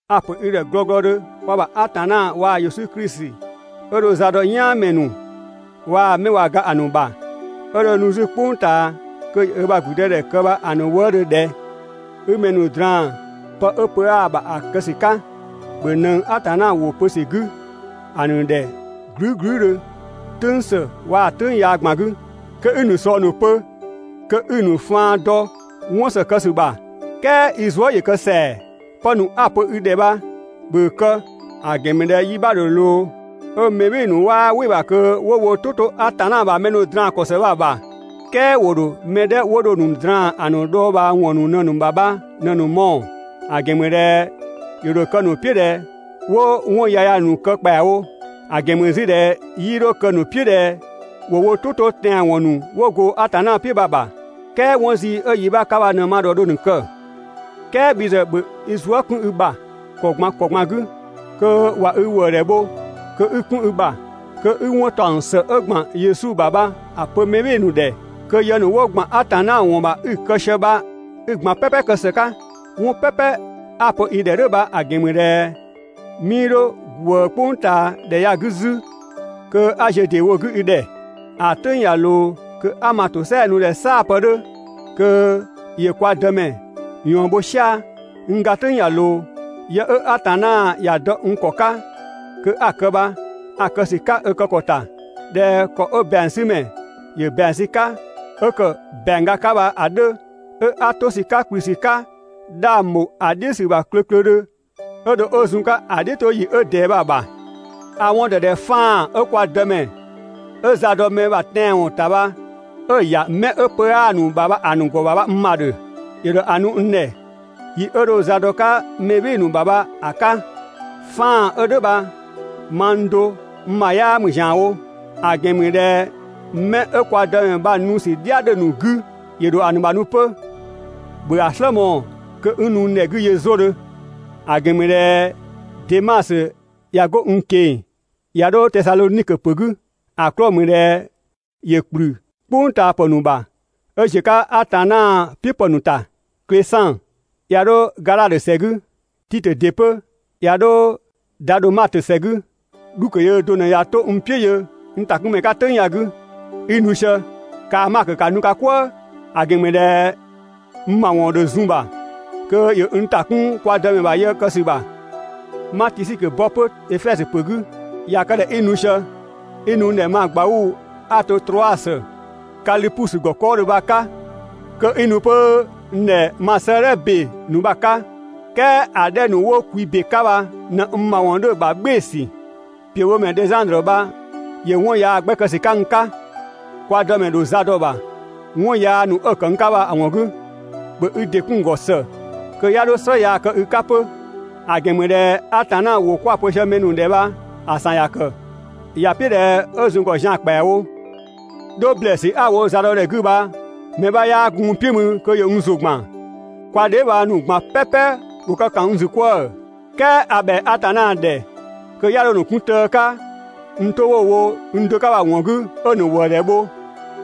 A‑ ‑pö i ‑dhɛ glɔglɔdhö kwa ‑bha Atanna waa‑ Yesu Klisi 'ö dho za dɔ "yaanmɛ ‑nu waa‑ 'mɛ ꞊wa ga‑ ‑nu ‑bha, 'ö dho nu 'zü "kpʋng ꞊taa kö ‑yö ö ‑bha ‑gblüdëdhɛ kë bha‑ ‑nu wëëdhö ꞊dhɛ: 'I mɛ ‑nu draan‑ pë 'ö pö 'aa‑ ‑bha ‑a kë ‑sü 'ka, ‑bhö ꞊nëng Atanna ‑wʋ pö ‑sü 'gü ‑a ‑nu ‑dhɛ glüü" glüüdhö "tʋ̈ng ‑së waa‑ "tʋ̈ng yaa ꞊gban 'gü, kö 'i‑ ‑nu ꞊sɔng ‑nu pö, kö 'i‑ ‑nu faan dɔ 'wɔn ‑së kë ‑sü ‑bha, "kɛɛ i zuë" ‑yö kë ‑sɛa. Pë ‑nu 'a‑ pö i ‑dhɛ bha, ‑bhö ‑a kë, ‑a ‑gɛn ‑mü ꞊dhɛ yi 'bha ‑dho ꞊loo 'ö mɛ "bhɩɩ‑ ‑nu 'waa "wɩ‑ ‑bha kö 'wo wo "tʋ 'to Atanna ‑bha mɛ draan‑ ‑kɔ ‑së bha‑ ‑bha, "kɛɛ ‑wo ‑dho mɛ 'dhɛ 'wo dho‑ ‑nu draan‑ ‑a ‑nu dhɔɔbhaawɔn ‑nu ꞊në‑ ‑bha bha ꞊në‑ mɔɔ‑, ‑a ‑gɛn ‑mü ꞊dhɛ ‑yö ‑dho kë‑ ‑nu "piʋ̈ ꞊dhɛ 'wo 'wɔn yaya ꞊në‑ kë ‑kpɛawo; ‑a ‑gɛn ‑mü 'zü ꞊dhɛ 'yii 'dho kë‑ ‑nu "piʋ̈ ꞊dhɛ 'wo wo "tʋ 'to tɛanwɔn ‑nu 'wo go Atanna "piʋ̈ bha‑ ‑bha, "kɛɛ 'wɔn zii 'ö yi 'bha 'ka bha ꞊në‑ ma ‑dhɔ dho‑ ‑nu kë. "Kɛɛ bhi ‑zë ‑bhö i zuë" 'kun i ‑bha ‑kɔ ꞊gban ‑kɔ ꞊gban 'gü, kö ꞊wa i ‑wëëdhɛ bho kö 'i‑ 'kun i ‑bha, kö 'i 'wɔn ‑taɔng ‑së 'ö ‑gban Yesu ‑bha bha‑ pö mɛ "bhɩɩ‑ ‑nu ‑dhɛ, kö yë ‑nu 'wo ‑gban Atanna ‑wɔn ‑bha 'i‑ kë sië bha 'i‑ ꞊gban "pɛpɛ kë ‑së 'ka! ('Wɔn "pɛpɛ 'a‑ pö i ‑dhɛ "dhʋ̈ bha‑ ‑gɛn ‑mü ꞊dhɛ 'mii 'dho ꞊gwëë "kpʋngtaadhɛ ya‑ 'gü 'zü kö 'a ziö ‑deewo 'gü i ‑dhɛ.) ‑A "tʋ̈ng ꞊ya ꞊loo kö 'a (ma ‑tosɛa nu ꞊dhɛ "saapë 'dhö kö ‑yö kwa Dëmɛ) ꞊yɔɔn bho "sia‑. N ga "tʋ̈ng ꞊ya ꞊loo. Yë 'ö Atanna ‑ya dɔ n ‑kɔ 'ka kö 'a‑ kë bha, a‑ kë ‑sü 'ka ö kë ‑kɔ ‑ta, ꞊dhɛ ‑kɔ 'ö ‑bɛangsümɛ ‑yö ‑bɛang sü‑ 'ka 'ö kë ‑bɛang ga 'ka bha‑ 'dhö 'ö 'a 'to ‑sü 'ka ‑kplü ‑sü 'ka 'dhang ‑bho ‑a "dhiʋ̈ ‑sü ‑bha klöklödhö 'ö dho 'ö zun‑ 'ka ‑a "dhiʋ̈toyi 'ö ꞊dɛɛ bha‑ ‑bha. A‑ 'wɔn ‑dɔ ꞊dhɛ 'faan‑ 'ö kwa Dëmɛ 'ö za dɔ mɛ ‑bha tɛanwɔn ‑ta bha 'ö‑ ‑ya 'mɛ 'ö pö 'aa‑ ‑nu ‑bha ‑a ‑nu ‑gɔ bha n ‑bha ‑dhö. ‑Yö ‑dho ‑a nu n ‑dhɛ yi 'ö dho za dɔ‑ 'ka mɛ "bhɩɩ‑ ‑nu ‑bha bha‑ 'ka. 'Faan‑ 'ö "dhʋ̈ bha mang do n ‑bha 'yaa ‑mü ‑zianwo, ‑a ‑gɛn ‑mü ꞊dhɛ 'mɛ 'ö kwa Dëmɛ bha‑ nu ‑sü "dhia 'dhö‑ ‑nu 'gü ‑yö ‑dho ‑a ‑nu ‑bha nu 'pö. ‑Bhö ‑a "slë mɔɔ‑ kö 'i nu n ‑dhɛ 'gü yö 'zodhö. ‑A ‑gɛn ‑mü ꞊dhɛ Demasö ꞊ya 'go n ꞊keng‑ ‑ya 'dho Tesadhonikö ‑pö 'gü, ‑a 'klɔɔ‑ ‑mü ꞊dhɛ ‑yö ‑kplü "kpʋngtaapë ‑nu ‑bha 'ö ꞊ziö‑ 'ka Atanna "piʋ̈ ‑pë ‑nu ‑ta. Klesan ꞊ya 'dho Gadhatö ‑sɛ 'gü, Titö ‑dɩ 'pö ꞊ya 'dho Dadhömatö ‑sɛ 'gü. Dhukö yöö do ꞊në ꞊ya 'to n "piʋ̈ yö n ‑takunmɛ 'ka "tʋ̈ng ya‑ 'gü. 'I nu sië, kaa‑ Makö ‑ka nu "kwëë, ‑a ‑gɛn ‑mü ꞊dhɛ n ‑mawɔn ‑dho zun‑ ‑bha kö ‑yö n ‑ta 'kun kwa Dëmɛ ‑bha yë kë ‑sü ‑bha. 'Ma Tisikö bɔ 'pö Efɛzö ‑pö 'gü. ꞊Ya kë ꞊dhɛ 'i nu sië, 'i nu n ‑dhɛ ma ꞊gbauu‑ 'a‑ to Troasö, Kalipusö ‑gɔ 'kɔɔdhö bha‑ 'ka. Kö 'i nu 'pö n ‑dhɛ ma 'sëëdhɛ ‑be ‑nu bha‑ 'ka, "kɛɛ ‑a 'dhɛ ‑nu 'wo kwi ‑be 'ka bha ꞊në n ‑mawɔn 'dhö‑ ‑bha "gbɩɩsü. ‑Piöbhomɛ Dhɛzandrö bha ‑yö 'wɔn yaa 'gbɛ ‑kë ‑sü 'ka n 'ka, kwa Dëmɛ ‑dho za dɔ‑ ‑bha 'wɔn yaa ‑nu 'ö‑ kë n 'ka bha‑ ‑wɔn 'gü. ‑Bhö i ‑dɩ 'kun‑ ‑gɔ ‑së kö 'ya 'dho "slë yaa kë i 'ka 'pö. ‑A ‑gɛn ‑mü ꞊dhɛ Atanna ‑wʋ 'kwa‑ pö sië mɛ ‑nu ‑dhɛ bha‑ ‑san ‑ya ‑kë. ‑Ya "piʋ̈ ꞊dhɛ 'ö zun‑ ‑gɔ zian‑ ‑kpɛawo. 'Dho ‑blɛɛsü 'a‑ wo zadɔdhɛ 'gü bha mɛ 'bha 'yaa gun n "piʋ̈ mü kö ‑yö n ‑zʋ ‑gban, kwa dheebhang ‑nu ꞊gban "pɛpɛ ‑wo kë ‑kan n ‑zü 'kwëë‑. "Kɛɛ a ‑bhɛa Atanna ‑dhɛ kö 'ya 'dho‑ ‑nu 'kun tëë 'ka n 'to 'wo‑ wo do 'ka bha‑ ‑wɔn 'gü 'ö‑ ‑nu ‑wëëdhɛ bho.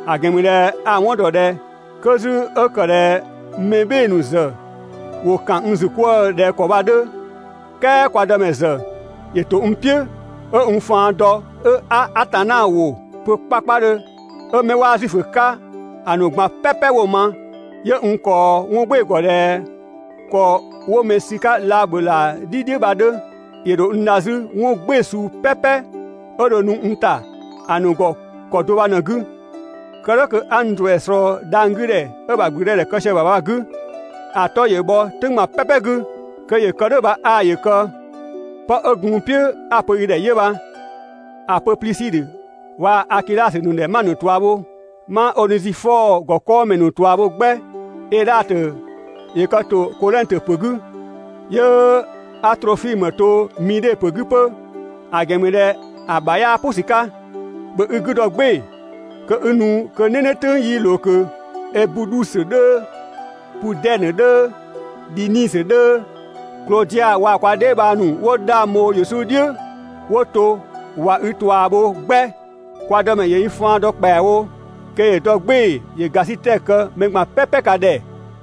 ‑A ‑gɛn ‑mü ꞊dhɛ a‑ 'wɔn ‑dɔ ꞊dhɛ 'kö 'zü 'ö ‑kë ꞊dhɛ mɛ "bhɩɩ‑ ‑nu ‑zë ‑wo ‑kan n ‑zü 'kwëë‑ ꞊dhɛ ‑kɔ bha‑ 'dhö, "kɛɛ kwa Dëmɛ ‑zë ‑yö ‑to n "piʋ̈, 'ö n faan dɔ 'ö 'a Atanna ‑wʋ pö 'kpakpadhö 'ö 'mɛ 'waa Zuifö 'ka‑ ꞊gban "pɛpɛ 'wo‑ ma. 'Yö n ꞊kɔɔ 'wɔn "gbɩɩ‑ ‑gɔ ꞊dhɛ ‑kɔ 'wo mɛ sü‑ 'ka laabhölaa "dhi "dhiʋ̈ bha‑ 'dhö. ‑Yö ‑dho n dha 'zü 'wɔn "gbɩɩ‑ suu "pɛpɛ 'ö dho nu n ‑ta ‑a ‑nu ‑gɔ ‑kɔ do bha ꞊në‑ 'gü, kë "dhʋ̈ kö 'a n ‑duɛ ꞊slɔɔ dhang‑ 'gü ‑dhɛ 'ö ö ‑bha ‑gblüdëdhɛ kë sië‑ ‑bha bha‑ 'gü. ‑A 'tɔ ‑yö bhɔ "tʋ̈ng ꞊gban "pɛpɛ 'gü! Kö ‑yö kë "dhʋ̈ bha 'aa ‑yö kë. ('Pë 'ö gun n "piʋ̈ 'a‑ pö i ‑dhɛ 'yö bha.) ‑A pö Plisidhö waa‑ Akidhasö ‑nu ‑dhɛ 'ma‑ ‑nu ꞊tua bho, ma Onezifɔɔ ‑gɔ 'kɔɔmɛ ‑nu ꞊tua bho 'gbɛ. Edhatö ‑yö kë ‑to Kodhɛngtö ‑pö 'gü, 'yö 'a Trofimö to Midhe ‑pö 'gü 'pö, ‑a ‑gɛn ‑mü ꞊dhɛ ‑a ‑bha 'yaa "pʋ ‑sü 'ka. ‑Bhö i 'gü dɔ "gbɩɩ‑ kö 'i nu kö "nɛnɛ "tʋ̈ng 'yi ꞊loo ꞊kö. Ebudhusö 'dhöö, Pudɛnö 'dhöö, Dhinisö 'dhöö, Klodia waa‑ kwa dheebhang ‑nu 'wo 'dhang bho Yesu "dhiʋ̈ 'wo to ꞊wa i ꞊tua bho 'gbɛ. Kwa Dëmɛ ‑yö i faan dɔ ‑kpɛawo, kö ‑yö dɔ "gbɩɩ‑ ‑yö ‑gasitɛ kë mɛ ꞊gban "pɛpɛ ka ‑dhɛ!